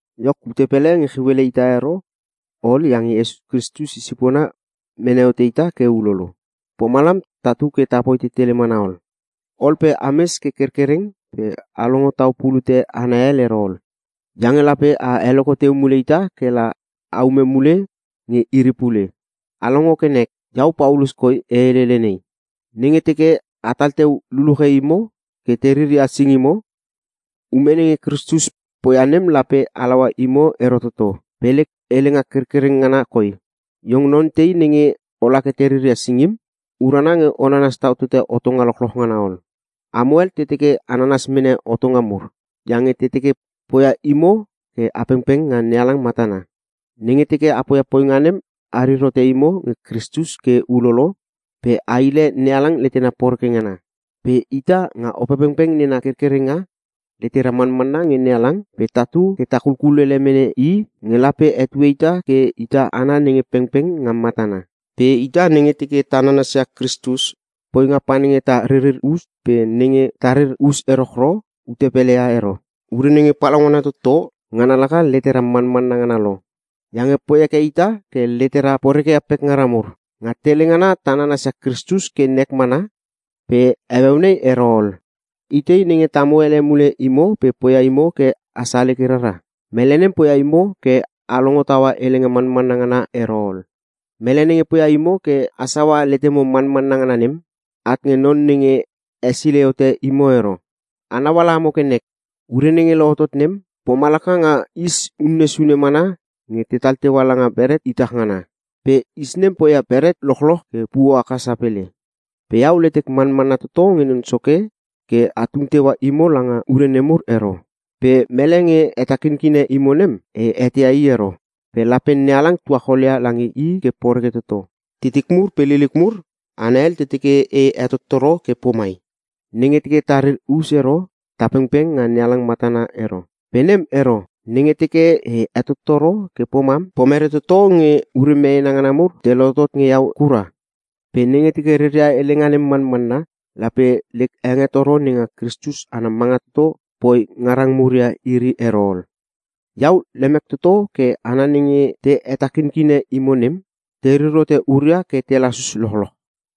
Iok, ute pele nge chiu ele ita ero ol iange Kristus i sipona mene hote ita ke ulolo. Pomalam tatu ke ta poi tetele mana ol. Ol pe ames ke kerkereng pe a longo tau pulute hana hel ero. Iange lape a heloko teu mule ita ke la aume mule nge iri pule. A longo ke nek! Iau Paulus koi e helele nei: Nenge teke atal teu luluche imo ke te riria singimo, ume nenge Kristus poia nem lape halaua imo ero toto. Pe lek helenga kerkereng ngana koi, iong non tei nenge ola ke te riria singim, urana nge o nanas tau tote hotonga lochloch ngana ol. Amo hel te teke a nanas mene hotonga mur, iange te teke poia imo ke a pengpeng nga NeHalang matana. Nenge teke a poia poinga nem arir hote imo nge Kristus ke ulolo pe a hile NeHalang letena poreke ngana. Pe ita, nga Opepengpeng nena kerkerenga, letera manmanna nge NeHalang pe tatu ke ta kulele mene I nge lape hetue ita ke ita hana nenge pengpeng nga matana. Pe ita, nenge teke ta nanasia Kristus, poinga pa nenge ta ririr us pe nenge tarir us erochro ute pele ia ero. Ure nenge palaungana toto ngana laka letera manmanna ngana lo. Iange poi heke ita ke letera porekeia pekngara mur. Nga tele ngana a nanasia Kristus ke nek mana pe heueu nei ero ol! Itei nenge tamo ele mule imo pe poia imo ke a saleke rara? Mele nem poia imo ke a longo taua helenga manmanna ngana ero ol! Mele nenge poia imo ke a saua letemo manmanna ngana nem, at nge Non nenge hesilei hote imo ero. Anau ala amo ke nek. Ure nenge lohotot nem, pomalaka nga is unne sune mana nge tetal teua langa beret itach ngana, pe is nem poia beret lochloch ke puo haka sapele. Pe iau letek manmanna toto nge Non Soke ke a tung teua imo langa ure nemur ero. Pe mele nge hetakinkine imo nem, e eteia i ero. Pe lape NeHalang tuachol ia lange i ke poreke toto. Titik mur pe liliuk mur, hana hel te teke e hetottoro ke pomai, “Nenge teke tarir us ero ta pengpeng nga NeHalang matana ero.” Pe nem ero. Nenge teke e hetottoro ke pomam, pomere toto nge ure meena ngana mur te lohotot nge iau kura? Pe nenge teke reria helenga nem manmanna, lape lek hengetoro nenga Kristus ana manga toto, poi ngarang mur ia iri ero ol. Iau lemek toto ke hana nenge te hetakinkine imo nem, terir hote huria ke te lasus lochloch!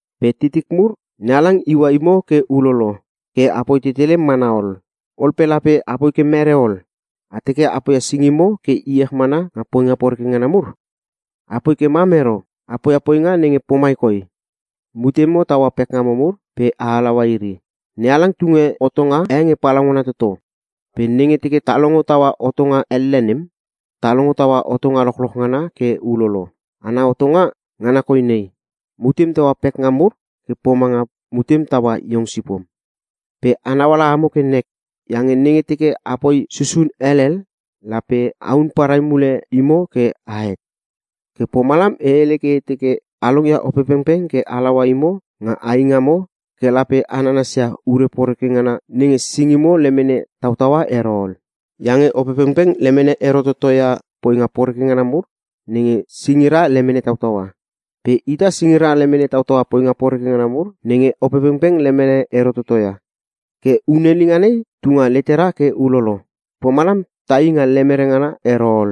Pe titik mur, NeHalang iua imo ke ulolo, ke apoi tetele mana ol. Ol pe lape apoi ke mere ol? A teke a poia singimo ke iech mana nga poinga poreke ngana mur? Apoi ke mam ero! A poia poinga nenge pomai koi: Mutemo taua pekngamo mur pe a halaua iri. NeHalang tunge hotonga e nge palaungana toto. Pe nenge teke ta longo taua hotonga elle nem, ta longo taua hotonga lochloch ngana ke ulolo. Ana hotonga, ngana koi nei: “Mutem taua pekngam mur ke pomanga mutem taua iong sipom.” Pe a nauala amo ke nek. Iange nenge teke a poi susun helel, lape ahun parai mule imo ke ahet. Ke pomalam e hele ke e teke, a longia Opepengpeng ke halaua imo nga ai ngamo ke lape a nanasia ure poreke ngana nenge singimo lemene tautaua ero ol. Iange Opepengpeng lemene ero toto ia poinga poreke ngana mur nenge singira lemene tautaua. Pe ita singira lemene tautaua poinga poreke ngana mur nenge Opepengpeng lemene ero toto ia. Ke hunelinga nei tu nga letera ke ulolo, pomalam tai nga lemere ngana ero ol.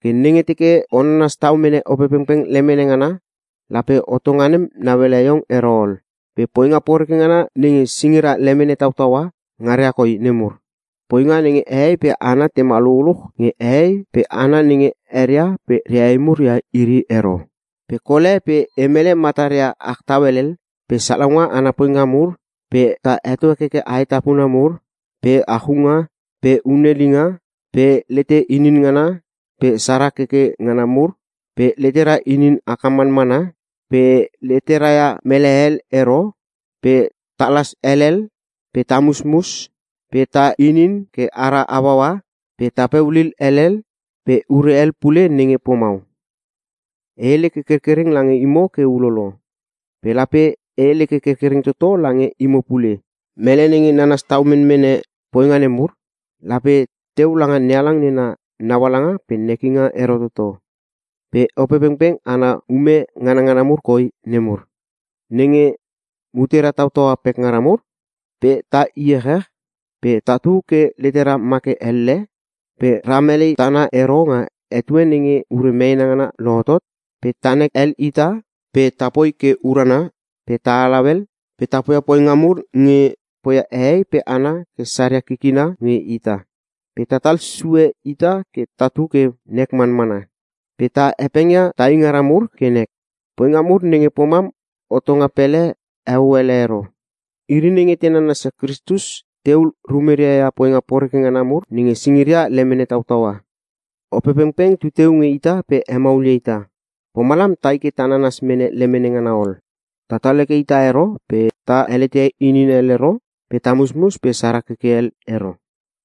Ke nenge teke o nanas tau mene Opepengpeng lemene ngana, lape hotonga nem nauele iong ero ol. Pe poinga poreke ngana nenge singira lemene tautaua, ngaria koi nemur. Poinga nenge: hehei pe hana tema lululuch nge hehei pe hana nenge eria pe reehei mur ia ero, pe kol e pe e mele mataria ach tau helel, pe salaunga ana poinga mur, pe ta heto hekeke aetapuna mur, pe achunga, pe hunelinga, pe lete inin ngana, pe sara keke ngana mur pe letera inin haka manmana, pe letera ia melehel ero, pe talas helel, pe ta musmus, pe ta inin ke ara hauaua, pe tapeu lil helel, pe ure hel pule nenge pomau. E hele ke kerkereng lange imo ke ulolo, pe lape e hele ke kerkereng toto lange imo pule: Mele nenge nanas tau menmene poinga nemur, lape teu langa NeHalang nena naualanga pe nekinga ero toto. Pe Opepengpeng, ana ume nganangana mur koi nemur. Nenge: Mutera tautaua pekngara mur, pe ta iechech, pe tatu ke letera ma ke elle, pe ra melei tana ero nga etue nenge ure meena ngana lohotot, pe tanek hel ita, pe tapoi ke urana pe ta halau hel, pe ta poia poinga mur nge poia hehei pe hana ke saria kikina nge ita. Pe tatal sue ita ke tatu ke nek manmana, pe ta hepengia tai ngara mur ke nek. Poinga mur nenge pomam hotonga pele heo ele ero. Iri nenge te nanasia Kristus, tehul rumeria ia poinga poreke ngana mur nenge singiria lemene tautaua. Opepengpeng tu teu nge ita pe hemaulia ita, pomalam tai ke ta nanas mene lemene ngana ol. Tatal heke ita ero pe ta helete inin hel ero pe ta musmus pe sara keke hel ero.